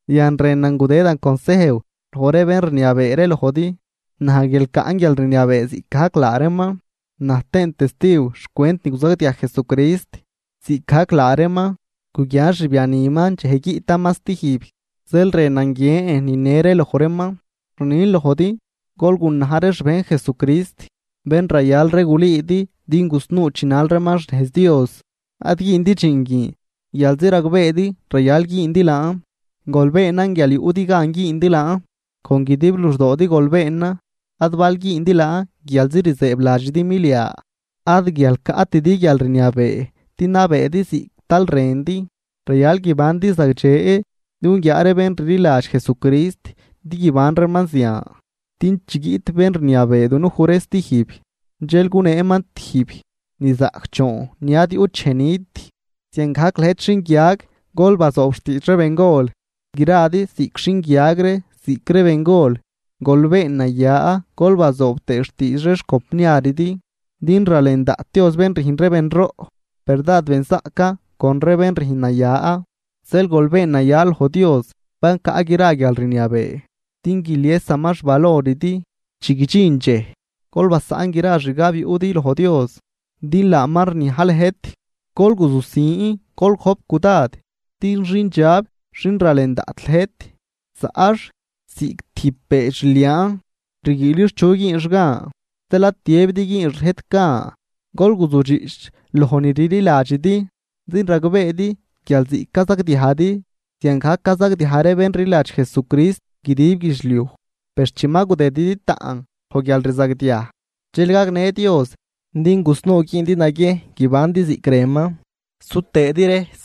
Yan rënan gudëdan consejw loj ree bén rniabee ree lojdi, naj guial caꞌn guialrniabee ziꞌcgajc laa reeman, na̱j tëën testiw xcwent ni guzagdiaj Jesucrist, ziꞌcgajc laa reeman guguian xbianiman dxej guiꞌtaman stijb, zeel rënan guiën nine ree loj reeman. Rnin lojdi, gol gunaj ree xbejn Jesucrist, bén rayal ree gulüüdi din gusnuu chinal reeman xnejz Dios. Ad güündi dxiin guin guialzi ragbeedi rayal güündi laan, gol beenan guial yuꞌdi gan güündi laan, con guidib luxdoodi gol beenan, ad bal güündi laan guialzi rzëëbladxidi milia. Ad guial caꞌtidi guialrniabee din nabeedi ziꞌc tal rëndi, rayal guibandi zagdxe din guguiaa ree bén rliladx Jesucrist din guiban reeman zian, din chi guiꞌt bén rniabee dunuj ree stijb, dxel guneeman tijb nizaꞌcdxoon ni ad yuꞌt dxej nit. Ziangajc lëjt xinguiag, gol bazoob xtiidx ree bengol. Gradi ziꞌc xinguiag ree ziꞌc ree bengol, gol been naya gol bazoob tëë xtiidx ree xcompniaridi, din: Ralen daꞌt Dios bén rüjn ree benroꞌ, per dád benzaꞌcan con ree bén rüjn naya. Zeel gol been naya loj Dios, bén caꞌ gra guialrniabee, din guiliesaman xvaloridi chi guidxin dxej. Gol basaꞌn gra xgab yuꞌdi loj Dios, din laaman rniaj lëjt. Gol guzujsin, gol gojp cudad, din xindxab xin ralen daꞌt lëjt, zaꞌx ziꞌc tijb beedx rliaan, rguiilix chu güünx gan. Zeel ad tiëbidi güünx lëjt gan, gol guzujdxiꞌch loj ni rliladxidi, din ragbeedi guial ziꞌc cazagdiajdi, ziangajc cazagdiaj ree bén rliladx Jesucrist guidib guidxliuj. Per chi ma gudëdidi taꞌn loj guialrzagdiaj, dxel gagnë Dios din gusnuu güündi naguiejn guibandi ziꞌc rënman, su tëëdi rejs,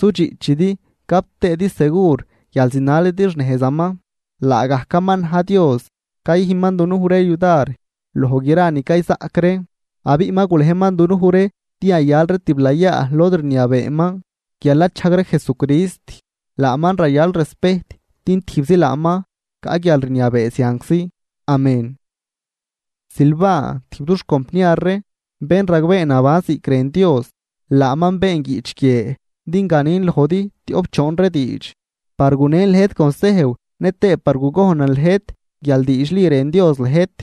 sudxiꞌchidi, gap tëëdi segur guial zinalidi xnejzaman. Laagajcaman na̱j Dios cayüjn dunuj ree yudar loj gra ni cayzaꞌc ree, abiꞌ ma gulejman dunuj ree din yayal ree tiblayaa lod rniabeeman guial nachajg ree Jesucrist. Laaman rayal respejt, din tijbzi laaman caꞌ guialrniabee zianczi. Amén. Silvan, tijb dux compniar ree, bén ragbeen naban ziꞌc rën Dios, laaman been guiꞌch guie din ganin lojdi tioꞌp choon diidx, par gunen lëjt consejw nëtëë par gugojnan lëjt guial diidxli rën Dios lëjt,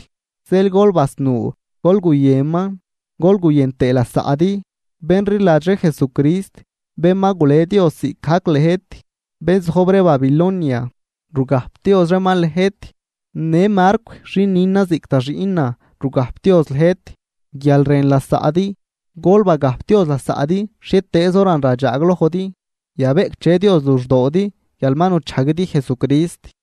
zeel gol basnuu gol guyënman gol guyën tëë lasaꞌdi. Bén rliladx ree Jesucrist, bén ma gulej Dios ziꞌcgajc lëjt, bén zojb ree Babilonia, rugajpdioz reeman lëjt. Në Marcw xin nünan ziꞌc da xiꞌnan rugajpdioz lëjt. Guial rën lasaꞌdi, gol bagajpdioz lasaꞌdi xhietëëz horan radxaaglojdi. Yabeꞌcdxe Dios luxdoodi guial ma nuchajguidi Jesucrist.